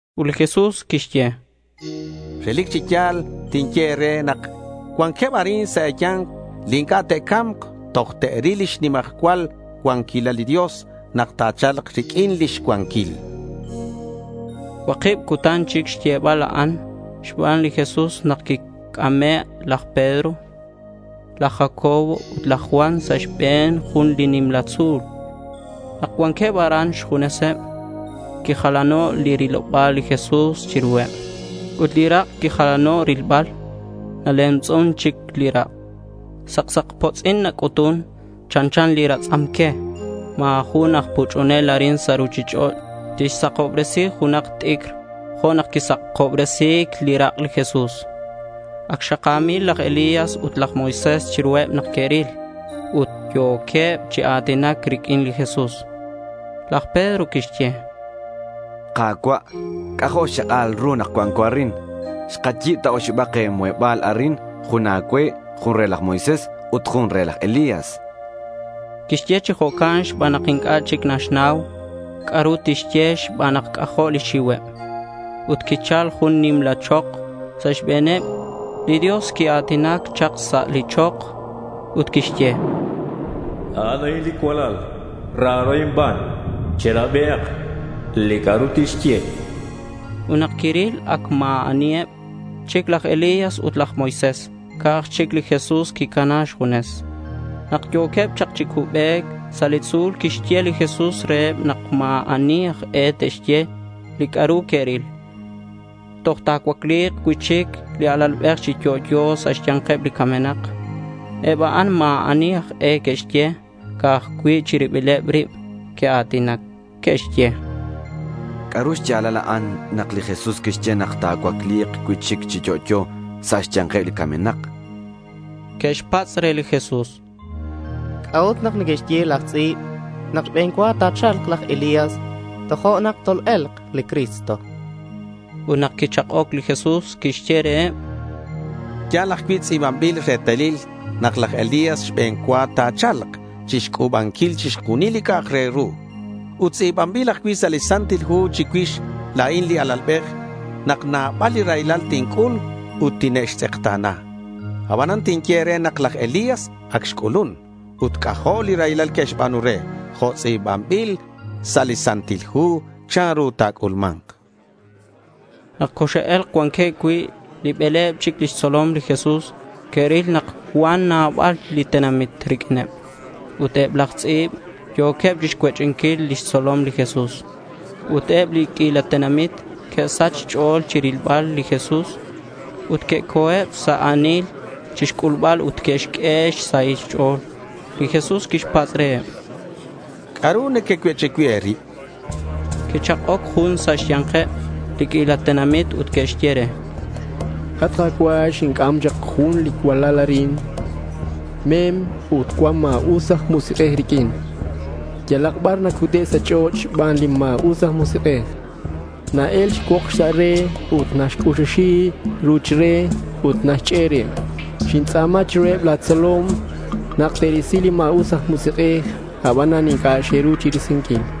Ut li Jesús quixye: —Relic chi ya̱l tinye e̱re nak cuanqueb arin sa' e̱ya̱nk li inc'a' te'ca̱mk toj te'ril lix nimajcual cuanquilal li Dios nak ta̱cha̱lk riq'uin lix xcuanquil.— Cuakib cutan chic xyebal a'an xban li Jesús nak quixc'ameb laj Pedro, laj Jacobo, ut laj Juan sa' xbe̱n jun li nimla tzu̱l. Nak cuanqueb aran xjuneseb, quijalano' li riloba̱l li Jesús chiruheb. Ut li rak' quijalano' rilbal. Nalemtz'un chic li rak'. Saksakpotz'in nac'utun, chanchan li ratz'am que. Ma̱ jun aj puch'unel arin sa' ruchich'och' tixsakobresi junak t'icr jo' nak quisakobresi̱c li rak' li Jesús. Ac xaka̱mil laj Elías ut laj Moisés chiruheb nak que'ril. Ut yo̱queb chi a̱tinac riq'uin li Jesús. Laj Pedro quixye: —Ka̱cua', c'ajo' xchak'al ru nak cuanco arin. Xkayi̱b ta oxibak muheba̱l arin. Jun a̱cue, jun re laj Moisés, ut jun re laj Elías.— Quixye chi jo'can xban nak inc'a' chic naxnau c'a'ru tixye xban nak c'ajo' lix xiuheb. Ut quichal jun nimla chok sa' xbe̱neb. Li Dios quia̱tinac chak sa' li chok, ut quixye: —A'in li cualal, raro inban. Cherabi li c'a'ru tixye.— Ut nak quiril ac ma̱ aniheb chic laj Elías ut laj Moisés. Ca'aj chic li Jesús quicana xjunes. Nak yo̱queb chak chi cubec sa' li tzu̱l quixye li Jesús reheb nak ma̱ ani aj e te'xye li c'a'ru que'ril toj ta̱cuacli̱k cui'chic li Alalbej chi yo'yo sa' xya̱nkeb li camenak. Eb a'an ma̱ ani aj e que'xye, ca'aj cui' chi ribileb rib que'a̱tinac. Que'xye: —¿C'a'ru xya̱lal a'an nak li Jesús quixye nak ta̱cuacli̱k cui'chic chi yo'yo sa' xya̱nkeb li camenak?— Que'xpatz' re li Jesús: —¿C'a'ut nak neque'xye laj tz'i̱b nak xbe̱n cua ta̱cha̱lk laj Elías tojo'nak tol-e̱lk li Cristo? chanqueb. Ut nak quichak'oc li Jesús quixye reheb: —Ya̱l ajcui' tz'i̱banbil retalil nak laj Elías xbe̱n cua ta̱cha̱lk chixc'u̱banquil chixjunil li c'a'ak re ru. Ut tz'i̱banbil ajcui' sa' li Santil Hu chicuix la̱in li Alalbej nak nabal li raylal tinc'ul ut tine'xtz'ekta̱na. Abanan tinye e̱re nak laj Elías ac xc'ulun ut c'ajo' li raylal que'xba̱nu re jo' tz'i̱banbil sa' li Santil Hu chanru ta̱c'ulma̱nk.— Nak coxe'e̱lk cuanqueb cui' li bele̱b chic lix tzolom li Jesús, que'ril nak cuan nabal li tenamit riq'uineb. Ut eb laj tz'i̱b yo̱queb chixcuech'inquil lix tzolom li Jesús. Ut eb li q'uila tenamit que'sach xch'o̱l chirilbal li Jesús, ut que'co̱eb sa' a̱nil chixc'ulbal ut que'xq'ue xsahil xch'o̱l. Li Jesús quixpatz' reheb: —¿C'a'ru nequecuech'i cui' e̱rib? chan. Quichak'oc jun sa' xya̱nkeb li q'uila tenamit ut quixye re: —At Ka̱cua', xinc'am chak jun li cualal arin. Mem ut cuan ma̱us aj musik'ej riq'uin. Yalak bar nacute' sa' ch'och' xban li ma̱us aj musik'ej. Na-el cuokx sa' re ut naxc'uxuxi li ruch re ut naxchec' rib. Xintz'a̱ma chiruheb la̱ tzolom nak te'risi li ma̱us aj musik'ej; abanan inc'a' xe'ru chirisinquil.—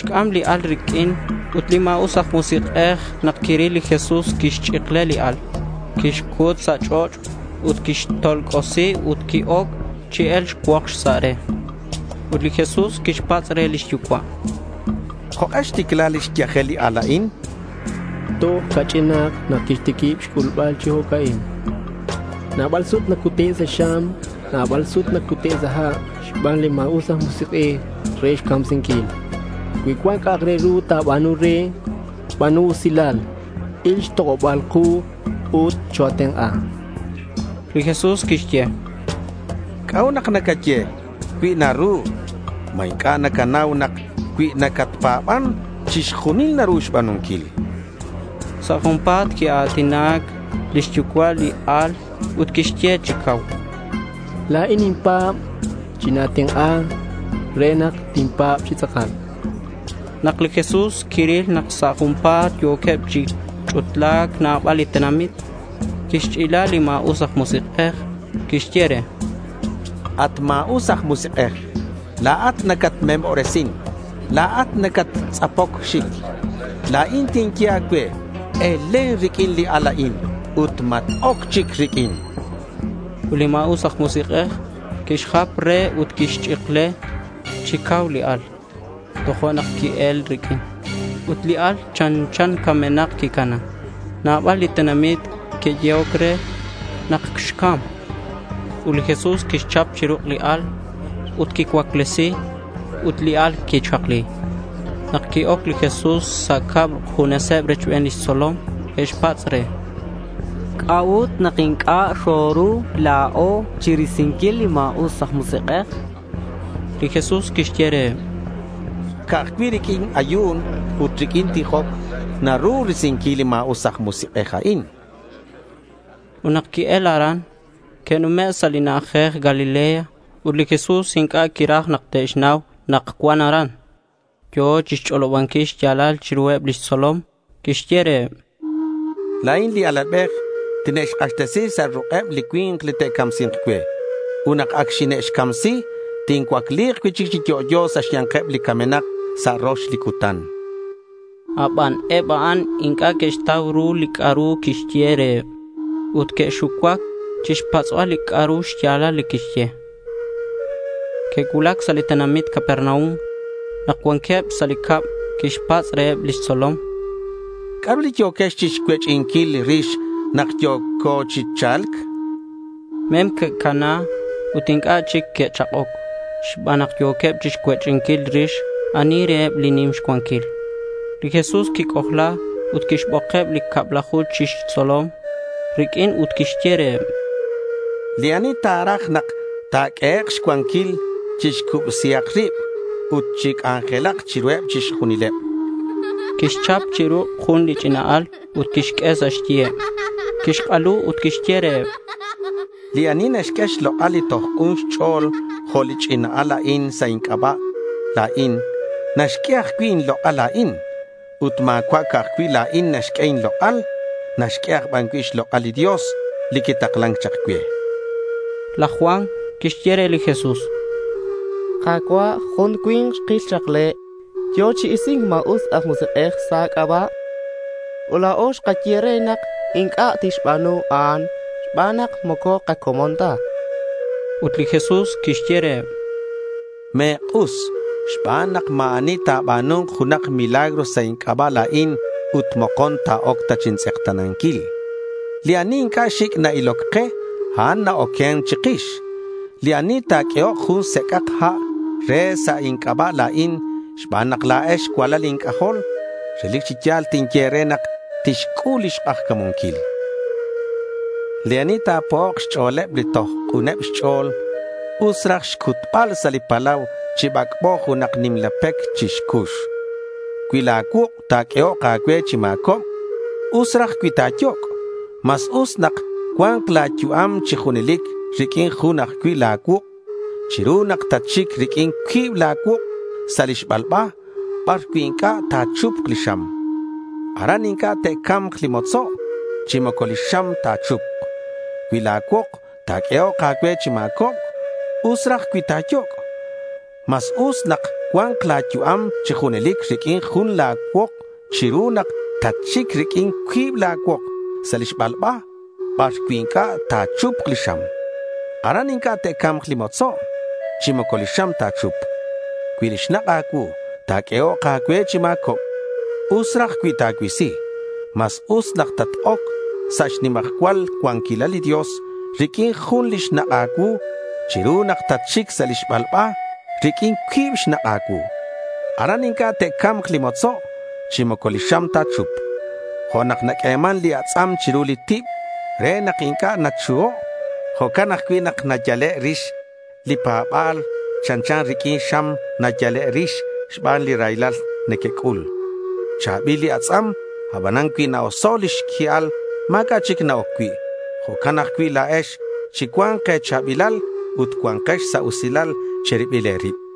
Que'xc'am li al riq'uin ut li ma̱us aj musik'ej nak quiril li Jesús quixch'ikle li al, quixcut sa' ch'och' ut quixtolc'osi ut qui-oc chi e̱lc cuokx sa' re. Ut li Jesús quixpatz' re lix yucua': —¿Jok'e xticla lix yajel li al a'in? chan. —Toj ca'ch'in nak quixtiquib xc'ulbal chi jo'ca'in, chan lix yucua'. —Nabal sut nacute' sa' xam. Nabal sut nacute' sa' ha' xban li ma̱us aj musik'ej re xcamsinquil. Cui cuan c'a'ru naru ta̱ba̱nu re, ba̱nu usilal, il xtok'oba ku ut choa̱tenk'a, chan. Li Jesús quixye: —¿C'a'ut nak nacaye “cui naru”? ¿Ma inc'a' nacanau nak cui nacatpa̱ban chixjunil naru xba̱nunquil? chan. Sa' junpa̱t quia̱tinac lix yucua' li al ut quixye chi cau, —La̱in ninpa̱b. China̱tenk'a re nak tinpa̱b chi tz'akal.— Nak li Jesús quiril nak sa' junpa̱t yo̱queb chi ch'utla̱c nabal li tenamit, quixch'ila li ma̱us aj musik'ej. Quixye re: —At ma̱us aj musik'ej, la̱at nacatmemobresin. La̱at nacattz'apoc xic. La̱in tinye a̱cue, elen riq'uin li al a'in ut mat-oc chic riq'uin, chan. Ut li ma̱us aj musik'ej quixjap re ut quixch'ikle chi cau li al. Tojo'nak qui-el riq'uin. Ut li al chanchan camenak quicana. Nabal li tenamit que'yehoc re nak xcam. Ut li Jesús quixchap chi ruk' li al ut quixcuaclesi ut li al quixakli. Nak qui-oc li Jesús sa' cab xjunes rochbeneb lix tzolom, que'xpatz' re: —¿C'a'ut nak inc'a' xoru la̱o chirisinquil li ma̱us aj musik'ej? chanqueb. Ut li Jesús quixye reheb: —Ca'aj cui' riq'uin ayu̱n ut riq'uin tijoc naru risinquil li ma̱us aj musik'ej a'in.— Ut nak que'el aran, que'nume' sa' li na'ajej Galilea. Ut li Jesús inc'a' quiraj nak te'xnau nak cuan aran. Yo̱ chixch'olobanquil xya̱lal chiruheb lix tzolom. Quixye reheb: —La̱in li Alalbej, tine'xk'axtesi sa' ruk'eb li cui̱nk li te'camsi̱nk cue. Ut nak ac xine'xcamsi, tincuacli̱k cui'chic chi yo'yo sa' xya̱nkeb li camenak sa' rox li cutan.— Aban eb a'an inc'a' que'xtau ru li c'a'ru quixye reheb, ut que'xucuac chixpatz'bal c'a'ru xya̱lal li quixye. Que'cuulac sa' li tenamit Capernaum. Nak cuanqueb sa' cab quixpatz' reheb lix tzolom: —¿C'a'ru li yo̱quex chixcuech'inquil rix nak yo̱co chi cha̱lc? chan. Mem que'cana ut inc'a' chic que'chak'oc xban nak yo̱queb chixcuech'inquil rix ani reheb li nim xcuanquil. Li Jesús quic'ojla ut quixbokeb li cablaju chi xtzolom riq'uin ut quixye reheb: —Li ani ta̱raj nak ta̱q'uehek' xcuanquil, chixcubsihak rib ut chic'anjelak chiruheb chixjunileb.— Quixchap chi ruk' jun li ch'ina al ut quixq'ue sa' xyiheb. Quixk'alu ut quixye reheb: —Li ani naxq'ue xlok'al li toj k'un xch'o̱l jo' li ch'ina al a'in sa' inc'aba' la̱in, naxq'ue ajcui' inlok'al la̱in. Ut ma̱cua' ca'aj cui' la̱in naxq'ue inlok'al. Naxq'ue aj ban cui' xlok'al li Dios li quitaklan chak cue.— Laj Juan quixye re li Jesús: —At Ka̱cua', jun cui̱nk xkil chak le'. Yo̱ chi isi̱nc ma̱us aj musik'ej sa' a̱c'aba'. Ut la̱o xkaye re nak inc'a' tixba̱nu a'an xban nak moco kacomon ta.— Ut li Jesús quixye reheb: —Me̱k'us xban nak ma̱ ani ta̱ba̱nu̱nk junak milagro sa' inc'aba' la̱in ut mokon ta̱oc ta chintz'ekta̱nanquil. Li ani inc'a' xic' na-iloc ke, a'an na-oquen chikix. Li ani ta̱q'uehok jun sec'ak ha' e̱re sa' inc'aba' la̱in xban nak la̱ex cualal inc'ajol, relic chi ya̱l tinye e̱re nak tixc'ul lix k'ajca̱munquil.— Li ani ta̱po'ok xch'o̱leb li toj k'uneb xch'o̱l, us raj xcutbal sa' li palau chi bac'bo junak nimla pec chi xcux. Cui la̱ cuuk' ta̱q'uehok a̱cue chi ma̱cobc, us raj cui ta̱yoc'. Mas us nak cua̱nk la̱ yu'am chi junelic riq'uin jun ajcui' la̱ cuuk' chiru nak tatxic riq'uin cuib la̱ cuuk' sa' li xbalba, bar cui' inc'a' ta̱chupk li xam. Aran inc'a' te'ca̱mk li motzo' chi moco li xam ta̱chupk. Cui la̱ cuok ta̱q'uehok a̱cue chi ma̱cobc, us raj cui ta̱yoc'. Mas us nak cua̱nk la̱ yu'am chi junelic riq'uin jun la̱ cuok chiru nak tatxic riq'uin cuib la̱ cuok sa' li xbalba, bar cui' inc'a' ta̱chupk li xam. Aran inc'a' te'ca̱mk li motzo' chi moco li xam ta̱chupk. Cui li xnak' a̱cuu ta̱q'uehok a̱cue chi ma̱cobc, us raj cui ta̱cuisi. Mas us nak tat-oc sa' xnimajcual cuanquilal li Dios riq'uin jun li xnak' a̱cuu chiru nak tatxic sa' li xbalba riq'uin cuib xnak' a̱cuu. Aran inc'a' te'ca̱mk li motzo' chi moco li xam ta̱chupk. Jo' nak naq'ueman li atz'am chiru li tib re nak inc'a' nachuho', jo'can ajcui' nak nayale' rix li kapa̱ba̱l. Chanchan riq'uin xam nayale' rix xban li raylal nakac'ul. Cha̱bil li atz'am, abanan cui na-oso' lix qui'al ma̱c'a' chic na-oc cui'. Jo'can ajcui' la̱ex chi cua̱nk e̱cha̱bilal ut cua̱nkex sa' usilal chi ribil e̱rib.